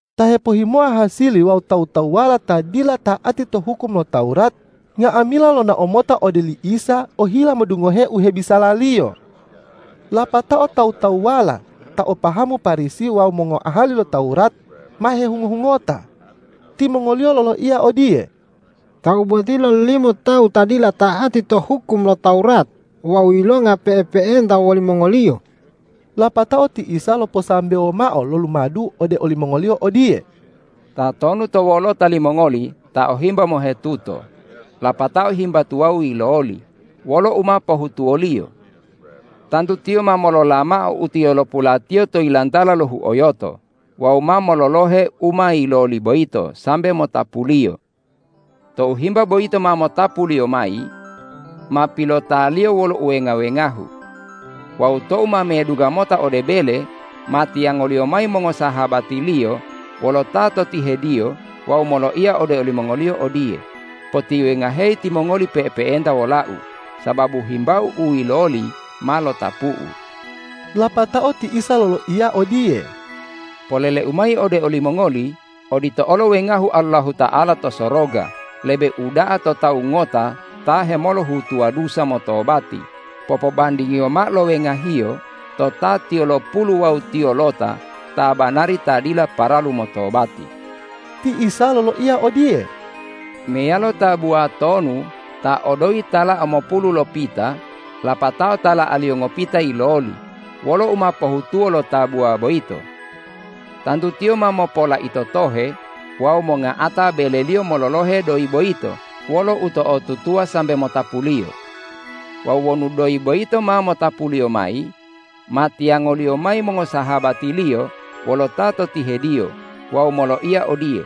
Ta hepohhimoa hasili wawu tawu-tawuwala ta dila ta'ati to hukum lo Tawurat nga'amila, lonao mota ode oli Isa ohila modungohe u hebisala-Liyo. Lapatao tawu-tawuwala ta o pahamu Parisi wawu mongoahali lo Tawurat ma hehungo-hungota. Timongoliyo loloiya odiye,”Tawu boti lololimo tawu ta dila ta'ati to hukum lo Tawurat wawu yilonga pe'epe'enta wolimongoliyo.” Lapatao ti Isa loposambewo mao lo lumadu ode olimongoliyo odiye, ”Tatonu to wolota limongoli ta o himba mohetuto, lapatao himba tuwawu yiloli, wolo u ma pohutuwoliyo? Tantu tiyo ma molola mao u tiyolopulatiyo to yilantala lo huoyoto wawu ma mololohe u ma yiloli boyito sambe motapuliyo. Tou himba boyito ma motapuliyo mayi, ma pilotaliyo wolo uwenga-wengahu. Wawu tou ma medungga mota ode bele, ma tiyangoliyo mayi mongosahabatiliyo wolo ta to tihediyo wawu moloiya ode olimongoliyo odiye, ’Potiwengaheyi timongoli pe'epe'enta wolau, sababu himbau u yiloli ma lotapu'u!’” Lapatao ti Isa loloiyo odiye,”Polele-U mayi ode olimongoli: Odito olo wengahu Allahuta'ala to soroga lebe uda'a to tawu ngota ta hemolohutuwa dusa motobati popobandingiyo mao lo wenga-Hiyo to ta tiyolopulu wawu tiyolota ta banari ta dila paralu motobati.” Ti Isa loloiya odiye,”Meyalo tabuwa tonu ta o doyi tala'a mopulu lopita, lapatao tala'aliyo ngopita yiloli, wolo u ma pohutuwo lo tabuwa boyito? Tantu tiyo ma mopolaito tohe wawu monga'ata beleliyo mololohe doyi boyito wolo uto'otutuwa sambe motapuliyo. Wawu wonu doyi boyito ma motapuliyo mayi, ma tiyangoliyo mayi mongosahabatiliyo wolo ta to tihediyo wawu moloiya odiye,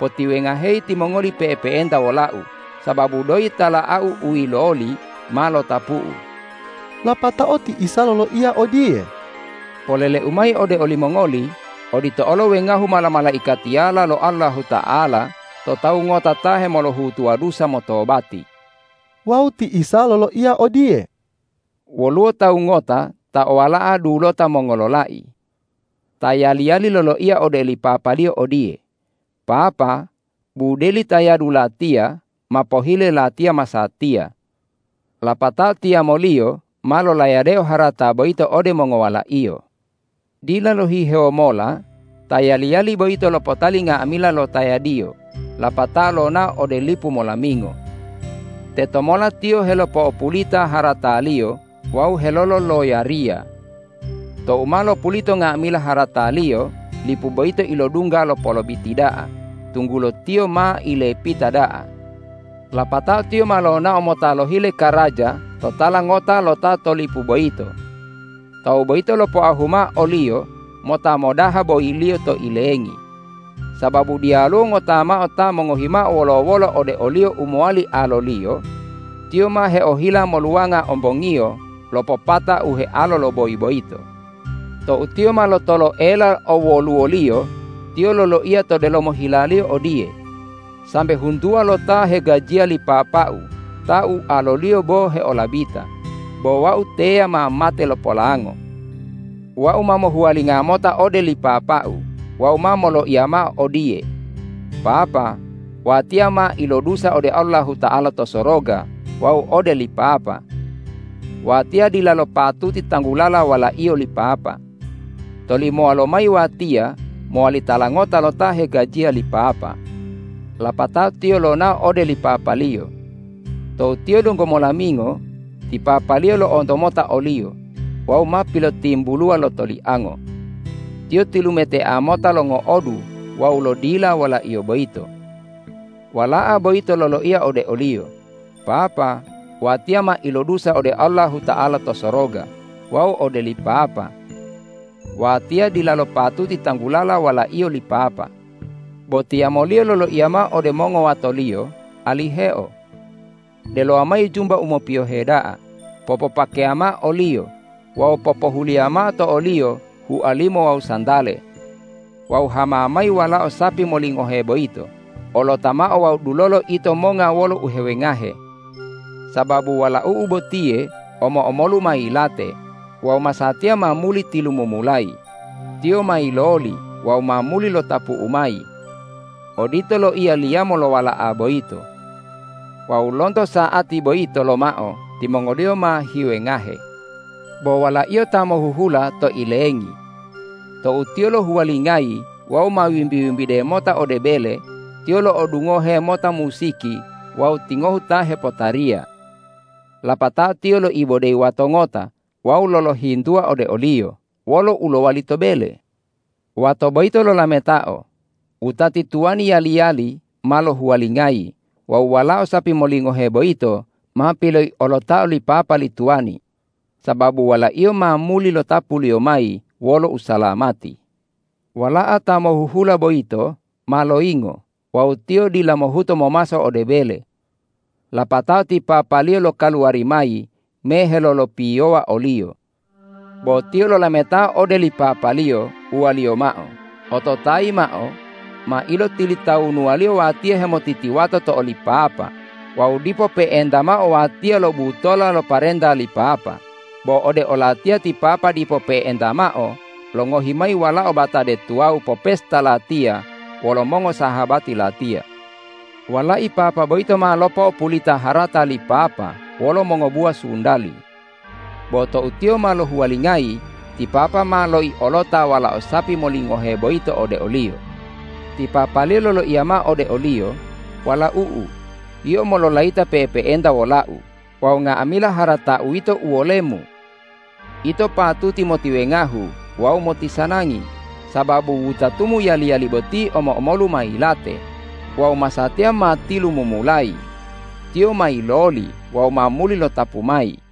’Potiwengaheyi timongoli pe'epe'enta wolau, sababu doyi tala'au u yiloli ma lotapu'u!’” Lapatao ti Isa loloiyo odiye,”Polele-U mayi ode olimongoli: Odito olo wengahu mala-malaikatiyala lo Allahuta'ala to tawu ngota ta hemolohutuwa dusa motobati.” Wawu ti Isa loloiya odiye,”Woluwo tawu ngota ta o wala'a dulota mongololai. Ta yali-yali loloiya ode li papaliyo odiye, ’Papa, budeli tayadu latiya ma pohile latiya masatiya.’ Lapatao tiyamoliyo ma lolayadeo harata boyito ode mongowalaiyo. Dila lohihewo mola ta yali-yali boyito lopotali nga'amila lo tayadiyo lapatao lonao ode lipu molamingo. Tetomola tiyo helopo'opulita harataliyo wawu helololoyariya. Tou ma lopulita nga'amila harataliyo, lipu boyito ilodungga lo polobiti da'a, tunggulo tiyo ma ilepita da'a. Lapatao tiyo ma lonao mota lohile karaja to tala ngota lo ta to lipu boyito. Tawu boyito lopoahu mao oliyo mota modaha boyiliyo to ilengi. Sababu diyaluwo ngota mao ta mongohi mao wolo-wolo ode oliyo u mowali aloliyo, tiyo ma heohila moluwanga ombongiyo lo popata u healo lo boyi boyito. Tou tiyo ma lotoloela owoluwoliyo, tiyo loloiya to delomo hilaliyo odiye, ’Sambe huntuwa lo ta hegajiya li papau ta ualoliyo bo heolabita, bo wau teya ma mate lo polango! Wau ma mohuwalinga mota ode li papau wawu ma moloiya mao odiye: Papa, watiya ma ilodusa ode Allahuta'ala to soroga wawu ode li papa. Watiya dilalo patuti tanggulala walaiyo li papa. Tolimowa lomayi watiya mowali tala ngota lo ta hegajiya li papa!’ Lapatao tiyo lonao ode li papaliyo. Tou tiyo donggo molamingo, ti papaliyo lo'onto mota oliyo wawu ma pilotimbuluwa lo toliango. Tiyo tilumetea mota longo'odu wawu lodila walaiyo boyito. Wala'a boyito loloiya ode oliyo, ’Papa, watiya ma ilodusa ode Allahuta'ala to soroga wawu ode li papa. Watiya dilalo patuti tanggulala walaiyo li papa.’ Bo tiyamoliyo loloiya mao ode mongowatoliyo, ’Aliheo! Delowa mayi jumba u mopiyohe da'a, popopakeya mao oliyo wawu popohuliya mao to oliyo hualimo wawu santale. Wawu hama mayi walao sapi molingohe boyito, olota mao wawu dulolo ito monga wolo uhewengahe. Sababu walau'u botiye omo-omolu ma yilate wawu masatiya ma muli tilumumulayi; tiyo ma yiloli wawu ma muli lotapu'u mayi.’ Odito loiya li yamo lo wala'a boyito. Wawu lonto sa'ati boyito lomao timongoliyo ma hiwengahe. Bo walaiyo ta mohuhula to ilengi. Tou tiyo lohuwalingayi wawu ma wimbi-wimbide mota ode bele, tiyo lo'odungohe mota musiki wawu tingohu ta hepotariya. Lapatao tiyo loibodeyi wato ngota wawu lolohintuwa ode oliyo, ’Wolo u lowali to bele?’ Wato boyito lolametao, ’Wutati tuwani yali-yali ma lohuwalingayi wawu walao sapi molingohe boyito ma piloiolotao li papa li tuwani, sababu walaiyo ma muli lotapuliyo mayi wolo usalamati!’ Wala'a ta mohuhula boyito ma loyingo wawu tiyo dila mohuto momaso ode bele. Lapatao ti papaliyo lokaluwari mayi me helolopiyowa oliyo. Bo tiyo lolametao ode li papaliyo, uwaliyo mao, ’Ototayi mao, ma ilotilitawunuwaliyo watiya hemotitiwato to oli papa wawu dipo pe'enta mao watiya lobutola lo parenta li papa, bo ode olatiya ti papa dipo pe'enta mao longohi mayi walao batade tuwawu popesta latiya wolo mongosahabati latiya. Walai papa boyito ma lopo'opulita harata li papa wolo mongobuwa sundali. Bo tou tiyo ma lohuwalingayi, ti papa ma loiolota walao sapi molingohe boyito ode oliyo.’ Ti papaliyo loloiya mao ode oliyo, ’Walau'u, yio mololayita pe'epe'enta wolau wawu nga'amila haratau yito uwolemu. Ito patuti motiwengahu wawu motisanangi, sababu wutatumu yali-yali boti omo-omolu ma yilate wawu masatiya ma tilumumulayi; tiyo ma yiloli wawu ma muli lotapu mayi.’”